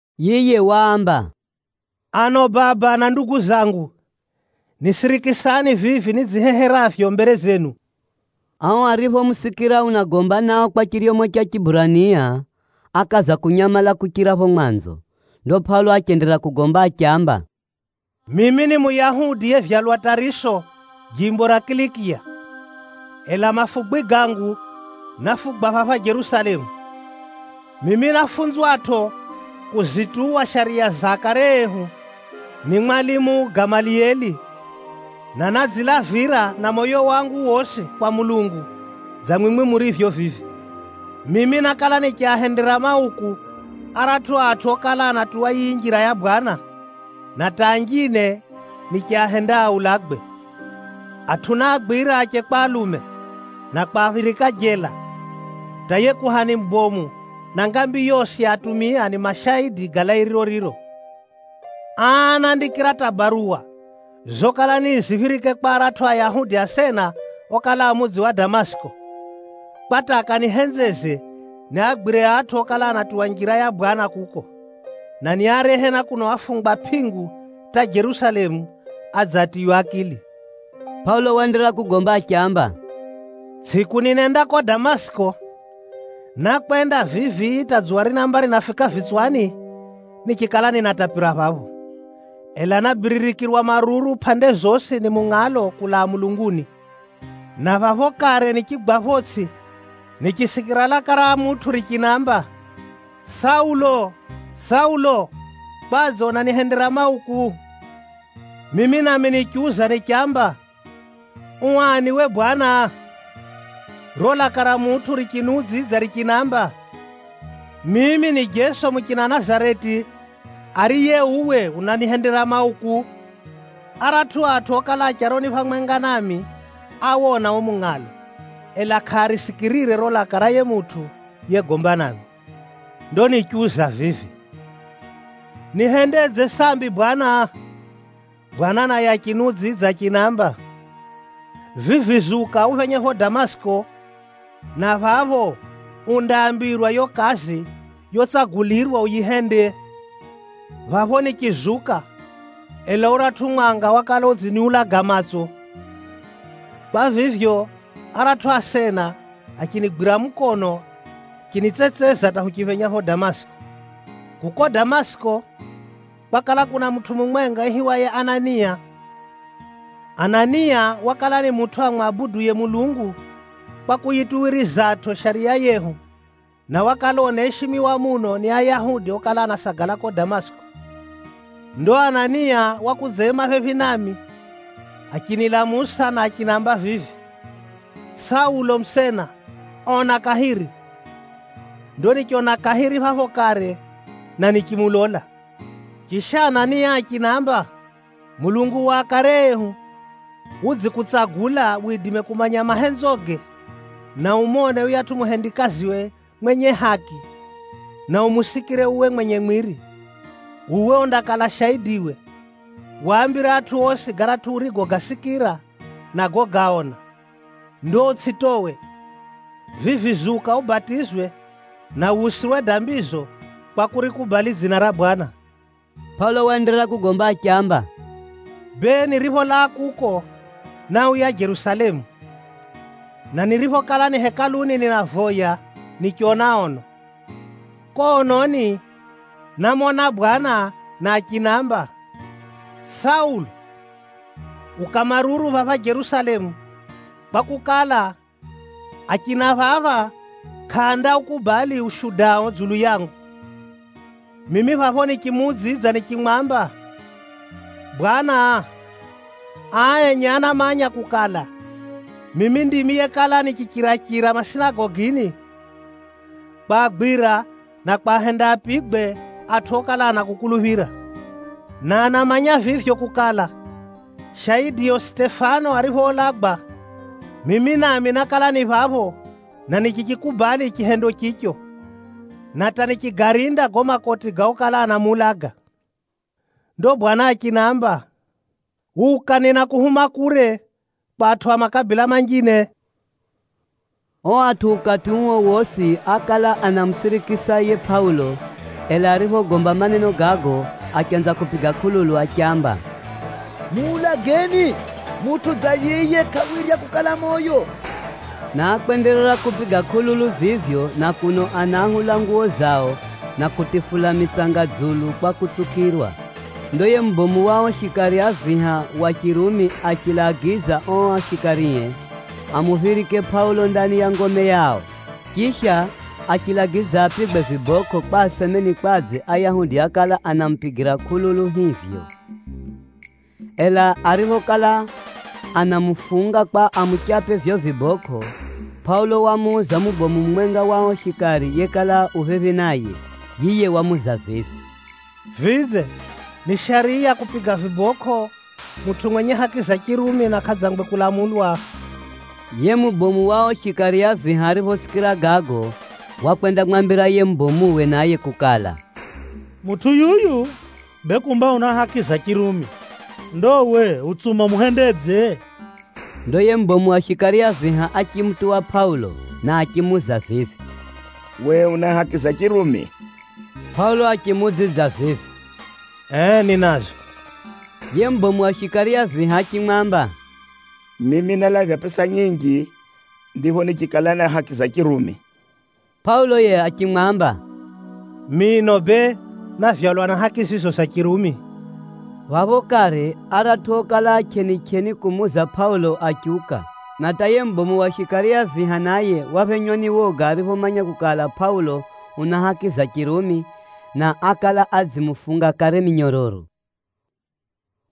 Yiye waamba, “Ano baba na ndugu zangu, nisirikisani vivi nidziheheravyo mbere zenu!” Ao ariphomusikira unagomba nao kwa chiryomo cha Chiburania, ákaza kunyamala kuchira phapho mwanzo. Ndo Pʼaulo achenderera kugomba, achiamba, “Mimi ni Muyahudi yevyalwa Tʼariso, jimbo ra Kilikiya. Ela mafugwi gangu, náfugwa phapha Jerusalemu. Mimi náfunzwatʼo kuzituwa shariya za akare ehu ni mwalimu Gamalieli, na nádzilavira na moyo wangu wosi kwa Mulungu dza mwimwi murivyo vivi. Mimi nákala nichiahendera mauku aratʼu atʼu okala anatuwa yiyi Njira ya Bwana, na hata anjine nichiahenda aulagwe. Atʼu náagwira ache kwa alume, na kwaphirika jela, hata yiye kuhani mubomu na ngambi yosi ya atumia ni mashaidi ga lairiro riro. Aa ánandikira hata baruwa zokala ni niziphirike kwa aratʼu Ayahudi asena okala a mudzi wa Damasiki, kwa hata akanihenzeze niagwire atʼu okala anatuwa Njira ya Bwana kuko, na niarehe na kuno afungwa pʼingu hata Jerusalemu, adze atiywe akili.” Pʼaulo waenderera kugomba achiamba, “Tsʼiku ninenda kuko Damasiki, nákwenda vivi hata dzuwa rinaamba rinafika vitswani, nichikala ninatapira phapho. Ela nábiririkirwa maruru pʼande zosi ni mungʼalo kulaa mulunguni. Na phapho kare nichigwa photsʼi nichisikira laka ra mutʼu richinamba, ‘Saulo, Saulo! Kwadze unanihendera mauku?’ Mimi nami nichiuza nichamba, ‘U ani uwe bwana?’ Riro laka ra mutʼu richiniudzidza richinamba, ‘Mimi ni Jeso muchina Nazareti, ariye uwe unanihendera mauku.’ Aratʼu atʼu okala a charoni phamwenga nami áwona uo mungʼalo, ela kʼaarisikirire riro laka ra yiye mutʼu yegomba nami. Ndo nichiuza vivi, ‘Nihendedze sambi Bwana?’ Bwana naye achiniudzidza achinamba, ‘Vivi zuka uphenye phapho Damasiki, na phapho undaambirwa yiyo kazi yotsagulirwa uyihende.’ Phapho nichizuka, ela uratʼu mwanga wakala udziniulaga matso. Kwa vivyo, aratʼu asena achinigwira mukono achinitsetseza hata huchiphenya phapho Damasiki. “Kuko Damasiki, kwakala kuna mutʼu mumwenga aihiwaye Anania. Anania wakala ni mutʼu amwabuduye Mulungu kwa kuyituwirizatʼo shariya yehu, na wakala unaishimiwa muno ni Ayahudi okala anasagala kuko Damasiki. Ndo Anania wakudzaima phephi nami, achinilamusa, na achinamba vivi, ‘Saulo musena, ona kahiri!’ Ndo nichona kahiri phapho kare, na nichimulola. Chisha Anania achinamba, ‘Mulungu wa akare ehu, udzikutsagula widime kumanya mahenzoge, na umone yuyatʼu Muhumikiwe mwenye haki, na umusikire uwe mwenye mwiri. Uwe undakala shaidiwe, waambire atʼu osi garatʼu urigogasikira, na gogaona. Ndo utsʼitowe. Vivi zuka ubatizwe, na wusirwe dambizo kwa kurikubali dzina ra Bwana.’” Pʼaulo waenderera kugomba achiamba, “Bee, niripholaa kuko, náuya Jerusalemu. Na niriphokala ni Hekaluni ninavoya, nichona ono. Kuko ononi, námona Bwana na achinamba, ‘Saulo! Uka maruru phapha Jerusalemu, kwakukala, achina phapha kʼaandaukubali ushudao dzulu yangu.’ Mimi phapho nichimuudzidza nichimwamba, ‘Bwana, aa enye anamanya kukala, mimi ndimi yekala nichichira-chira masinagogini, kwagwira, na kwahenda apigwe atʼu okala anakukuluphira. Na anamanya vivyo kukala, shaidio Sitefano ariphoulagwa, mimi nami nákala ni phapho, na nichichikubali chihendo chicho, na hata nichigarinda gago makoti ga okala anamuulaga.’ Ndo Bwana achinamba, ‘Uka ninakuhuma kure, kwa atʼu a makabila manjine.’” Ao atʼu ukati uo wosi ákala anamusirikisa yiye Pʼaulo, ela ariphogomba maneno gago, achanza kupiga kʼululu achiamba, “Muulageni! Mutʼu dza yiye kʼawirya kukala moyo.” Na ákwenderera kupiga kʼululu vivyo na kuno anaahula nguwo zao na kutifula mitsanga dzulu kwa kutsukirwa. Ndo yiye mubomu wa ao shikari a viha wa Chirumi achilagiza ao shikarie amuphirike Pʼaulo ndani ya ngome yao. Chisha, achilagiza apigwe vibokʼo kwa aseme ni kwadze Ayahudi ákala anamupigira kʼululu hivyo. Ela ariphokala anamufunga kwa amuchape vivyo vibokʼo, Pʼaulo wamuuza mubomu mumwenga wa ao shikari yekala u phephi naye. Yiye wamuuza vivi, “Vidze, ni shariya kupiga vibokʼo mutʼu mwenye haki za Chirumi na kʼadzangwe kulamulwa?” Yiye mubomu wa ao shikari a viha ariphosikira gago, wakwendamwambira yiye mubomuwe naye kukala, “Mutʼu yuyu, bee kumba una haki za Chirumi! Ndo uwe, utsuma umuhendedze?” Ndo yiye mubomu wa shikari a viha achimutuwa Pʼaulo, na achimuuza vivi, “Uwe una haki za Chirumi?” Pʼaulo achimuudzidza vivi, “Ee ninazo.” Yiye mubomu wa shikari a viha achimwamba, “Mimi nálavya pʼesa nyinji ndipho nichikala na haki za Chirumi.” Pʼaulo yiye achimwamba, “Mino bee návyalwa na haki zizo za Chirumi.” Phapho kare aratʼu okala a chʼenichʼeni kumuuza Pʼaulo achiuka. Na hata yiye mubomu wa shikari a viha naye waphenywa ni woga ariphomanya kukala, Pʼaulo una haki za Chirumi, na ákala adzimufunga kare minyororo.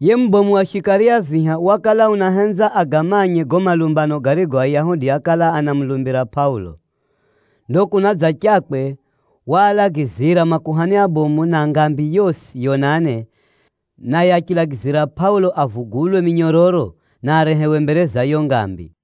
Yiye mubomu wa shikari a viha wakala unahenza agamanye gago malumbano garigo Ayahudi ákala anamulumbira Pʼaulo. Ndo kunadzachakwe, waalagizira makuhani abomu na ngambi yosi yonane, naye achilagizira Pʼaulo avugulwe minyororo, na arehewe mbere za yiyo ngambi.